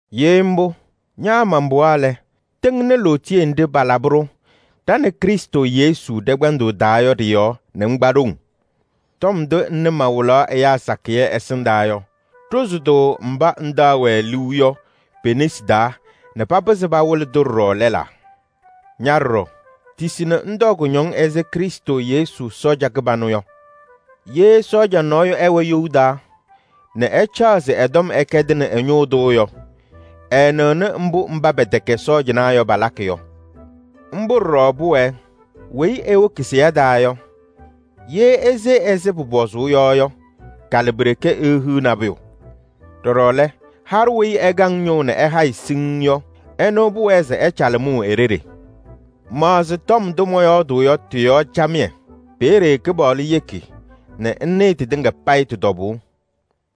Ye mbʋ, ña man-pɩɣa lɛ, tɩŋnɩ lootiye nɖɩ palabɩ-ɖʋ ɖa nɛ Krɩstʋ Yesu ɖɛ-kpɛndʋʋ taa yɔ ɖɩ-yɔɔ nɛ ŋkpa ɖoŋ. Tɔm ndʋ ŋnɩ mawɩlaɣ ɛyaa sakɩyɛ ɛsɩndaa yɔ, ɖʋzɩ-tʋ mba ŋtaɣ-wɛ liu yɔ pe-nesi taa nɛ papɩzɩ pawɩlɩ-tʋ ɖɔɖɔ lɛlaa. Ña ɖɔɖɔ, tisi nɛ ŋtɔɔ kʋñɔŋ ɛzɩ Krɩstʋ Yesu sɔɔja kɩbanʋ yɔ. Ye sɔɔja nɔɔyʋ ɛwɛ you taa nɛ ɛcaɣ se ɛ-tɔm ɛkɛdɩnɩ ɛ-ñʋʋ tʋ yɔ, ɛɛnɩɣnɩ mbʋ mba pɛtɛkɛ sɔɔjanaa yɔ palakɩ yɔ. Mbʋ ɖɔɖɔ pʋwɛɛ: weyi ewoki seya taa yɔ, ye ese ɛzɩ pʋpɔzʋʋ yɔ yɔ, kalɩ pi-ɖeke eehiɣ nabʋyʋ. Ɖɔɖɔ lɛ, haɖʋ weyi ɛkaŋ ñʋʋ nɛ ɛhayɩ siŋŋ yɔ, ɛnʋ pʋwɛɛ se ɛcalɩ mʋʋ e-ɖeɖe. Maɣzɩ tɔm ndʋ mɔyɔɔdʋʋ yɔ tɩ-yɔɔ camɩyɛ, peeye Kɩpaɣlʋ yeki nɛ ŋnɩɩ tɩtɩŋa payɩ tɩ-tɔbʋʋ.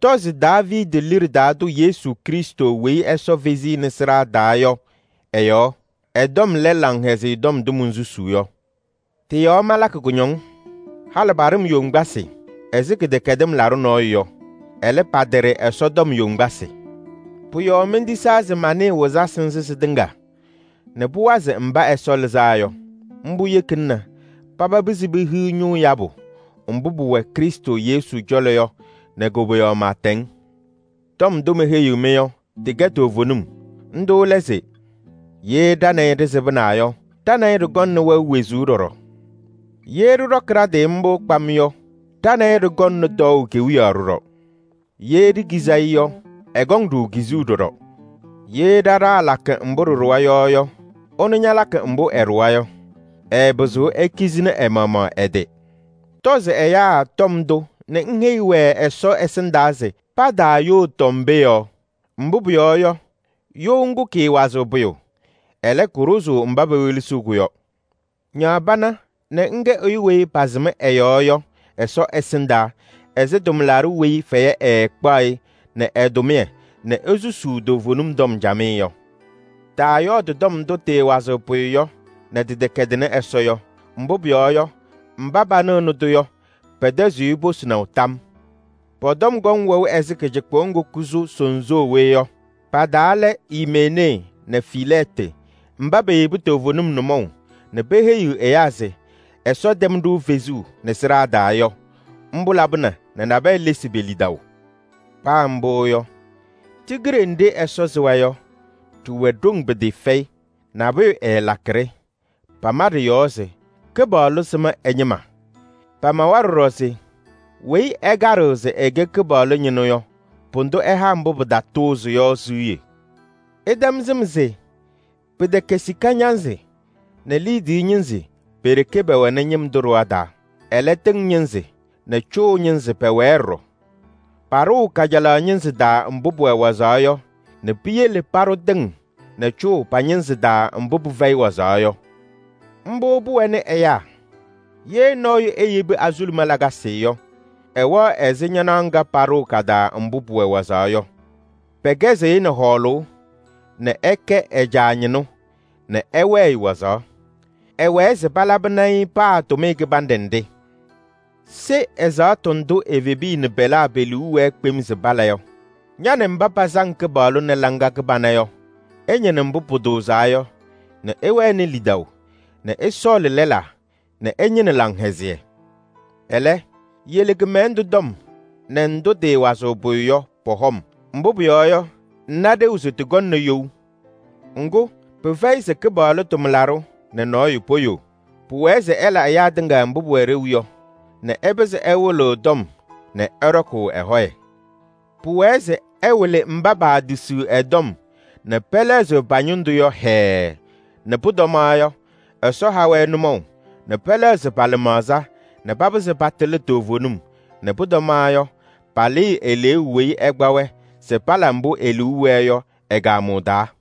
Tɔzɩ Daaviidi liɖe taa tʋ Yesu Krɩstʋ weyi Ɛsɔ fezi-i nɛ sɩɖaa taa yɔ ɛ-yɔɔ. Ɛ-tɔm lɛ Laŋhɛzɩyɛ Tɔm ndʋ monsusuu yɔ. Tɩ-yɔɔ malakɩ kʋñɔŋ, halɩ paɖɩ-m yoŋgbasɩ ɛzɩ kɩdɛkɛdɩm laɖʋ nɔɔyʋ yɔ. Ɛlɛ, pataɖɩ Ɛsɔ tɔm yoŋgbasɩ. Pʋ-yɔɔ mentisaa se manɩɩ wɩzasɩ nzɩ sɩtɩŋa nɛ pʋwazɩ mba Ɛsɔ lɩzaa yɔ. Mbʋ yekina nɛ paba pɩzɩ pehiɣ ñʋʋ yabʋ mbʋ pʋwɛ Krɩstʋ Yesu cɔlɔ yɔ nɛ koboyaɣ pɩɩtɛŋ. Tɔm ndʋ meheyiɣ-mɩ yɔ, tɩkɛ toovenim. Ndʋ lɛ se: “Ye ɖa nɛ ɩ ɖɩsɩbɩna yɔ, ɖa nɛ ɩ ɖɩkɔŋnɩ wɛʋ wezuu ɖɔɖɔ. Ye ɖɩɖɔkɩ ɖa-tɩ mbʋ kpam yɔ, ɖa nɛ ɩ ɖɩkɔŋnɩ tɔɔʋ kewiyaɣ ɖɔɖɔ. Ye ɖikizi-i yɔ, ɛkɔŋ-ɖʋ kizuu ɖɔɖɔ. Ye ɖa ɖaalakɩ mbʋ ɖɩɖʋwa yɔ yɔ, ɛnʋ ñalakɩ mbʋ ɛɖʋwa yɔ, ɛɛpɩzɩɣ ekizini ɛ-maɣmaɣ ɛ-tɩ.” Tɔzɩ ɛyaa tɔm ndʋ nɛ ŋheyi-wɛ Ɛsɔ ɛsɩndaa se pataayoo tɔm pee yɔɔ. Mbʋ pʋyɔɔ yɔ, you ŋgʋ kɩɩwazɩɣ pʋyʋ, ɛlɛ, kʋɖʋzʋʋ mba pewelesiɣ-kʋ yɔ. Ñaɣ pana nɛ ŋkɛ ɛyʋ weyi pasɩm ɛ-yɔɔ yɔ Ɛsɔ ɛsɩndaa ɛzɩ tʋmlaɖʋ weyi fɛyɛ ɛɛkpaɣ-ɩ nɛ ɛ-tʋmɩyɛ nɛ esusuu toovenim tɔm camɩyɛ yɔ. Taayɔɔdɩ tɔm ndʋ tɩɩwazɩɣ pʋyʋ nɛ tɩtɛkɛdɩnɩ Ɛsɔ yɔ, mbʋ pʋyɔɔ yɔ, mba panɩɣnɩ-tʋ yɔ, pɛtɛzɩɣ-ɩ posinaʋ tam yɔɔ. Pɔ-tɔm kɔŋ wɛʋ ɛzɩ kɩcɩkpʋʋ ŋgʋ kʋsʋ sooye yɔ. Pa-taa lɛ: Imenee nɛ Filɛɛtɩ mba peyebi toovenim nʋmɔʋ nɛ peheyiɣ ɛyaa se Ɛsɔ tɛm-ɖʋ fezuu nɛ sɩɖaa taa yɔ. Mbʋ labɩna nɛ nabɛyɛ lesi pe-lidaʋ. Paa mbʋ yɔ, tigiɖe nɖɩ Ɛsɔ sɩwa yɔ, ɖɩwɛ ɖoŋ pɩtɩɩfɛyɩ, nabʋyʋ ɛɛlakɩ-ɖɩ. Pama ɖɩ-yɔɔ se: “Kɩpaɣlʋ sɩm ɛ-ñɩma.” Pamawa ɖɔɖɔ se: “Weyi ɛkaɖɩɣ se ɛkɛ Kɩpaɣlʋ ñɩnʋ yɔ, pʋdʋ ɛha mbʋ pɩtatʋʋzɩ yɔ siɣye.” Ɩtɛm sɩm se: pɩtɛkɛ sika ñanzɩ nɛ liidiye ñɩnzɩ pe-ɖeke pɛwɛnɩ ñɩm tʋ ɖɩɣa taa. Ɛlɛ, tɩŋ ñɩnzɩ nɛ cʋʋ ñɩnzɩ pɛwɛɛ ɖɔɖɔ. Paɖʋʋ kajalaɣ ñɩnzɩ taa mbʋ pʋwɛ wazaɣ yɔ nɛ piyele paɖʋ tɩŋ nɛ cʋʋ pa-ñɩnzɩ taa mbʋ pɩfɛyɩ wazaɣ yɔ. Mbʋ pʋwɛnɩ ɛyaa: ye nɔɔyʋ eyebi azuluma lakasɩ yɔ, ɛwɛɣ ɛzɩ ñanaɣ ŋga paɖʋʋ ka-taa mbʋ pʋwɛ wazaɣ yɔ. Pɛkɛzɩɣ-ɩ nɛ hɔɔlʋʋ se ɛkɛ ɛ-caa ñɩnʋ nɛ ɛwɛɛ-ɩ wazaɣ. Ɛwɛɛ se palabɩnɩ-ɩ paa tʋmɩyɛ kɩbanɖɛ nɖɩ. Se ɛzaɣtʋ ndʋ evebiya nɛ pɛlaa pe-liu wɛɛ kpem se pala yɔ. Ña nɛ mba pasaŋ Kɩpaɣlʋ nɛ laŋa kɩbana yɔ, ɩñɩnɩ mbʋ pʋtʋʋzaa yɔ nɛ ɩwɛnɩ lidaʋ nɛ ɩsɔɔlɩ lɛlaa nɛ ɩñɩnɩ laŋhɛzɩyɛ. Ɛlɛ, yele kɩmɛlɛndʋ tɔm nɛ ndʋ tɩɩwazɩɣ pʋyʋ yɔ pɔ-hɔm, mbʋ pʋyɔɔ yɔ, ŋna ɖeu se tɩkɔŋnɩ you. Ŋgʋ, pɩfɛyɩ se Kɩpaɣlʋ tʋmlaɖʋ nɛ nɔɔyʋ poyoo. Pʋwɛɛ se ɛla ɛyaa tɩŋa mbʋ pʋwɛ ɖeu yɔ nɛ ɛpɩzɩ ɛwɩlɩɣ tɔm nɛ ɛɖɔkʋʋ ɛ-hɔyɛ. Pʋwɛɛ se ɛwɩlɩ mba paatisiɣ ɛ-tɔm nɛ pɛlɛɣzɩɣ pa-ñɩndʋ yɔ hɛɛɛ nɛ pʋtɔma yɔ, Ɛsɔ ha-wɛ nʋmɔʋ nɛ pɛlɛɣzɩ pa-lɩmaɣza nɛ papɩzɩ patɩlɩ toovenim nɛ pʋtɔma yɔ, palɩɩ eleeu weyi ɛkpa-wɛ se pala mbʋ e-liu wɛɛ yɔ ɛ-kaamʋʋ taa.